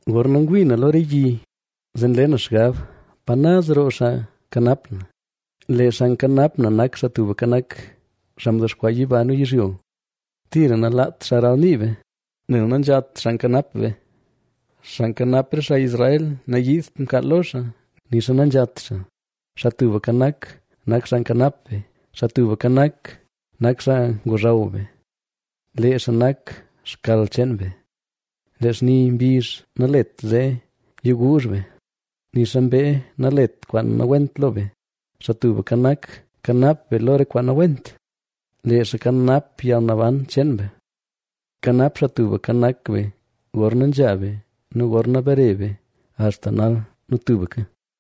Gorna ngwii na lo re yi, zee nle na xgab: “¿Pa naz roo xaa kanap na?” Lee xaa nkanap na nak Xaa Tubka Nak, xaa mdexkwaa yiba nu yizhyo. Tira nalaat xaa ralnii be, nel nanzhat xaa nkanap be. Xaa nkanap re xaa Israel nanyiidt mkaal lo xaa, nixa nanzhat xaa. Xaa Tubka Nak, nak xaa nkanap be, Xaa Tubka Nak, nak xaa ngozhaw be, lee xaa nak xkal cheen be. Lee xni mbizh nalet zee yiguuzh be, nixa mbee nalet kwaan nawent lo be. Xaa Tubka Nak kanap be lo re kwaan nawent; lee xaa kanap yalnaban cheen be. Kanap Xaa Tubka Nak be gorna nzha be nu gorna bare be, axta nal nu tubka.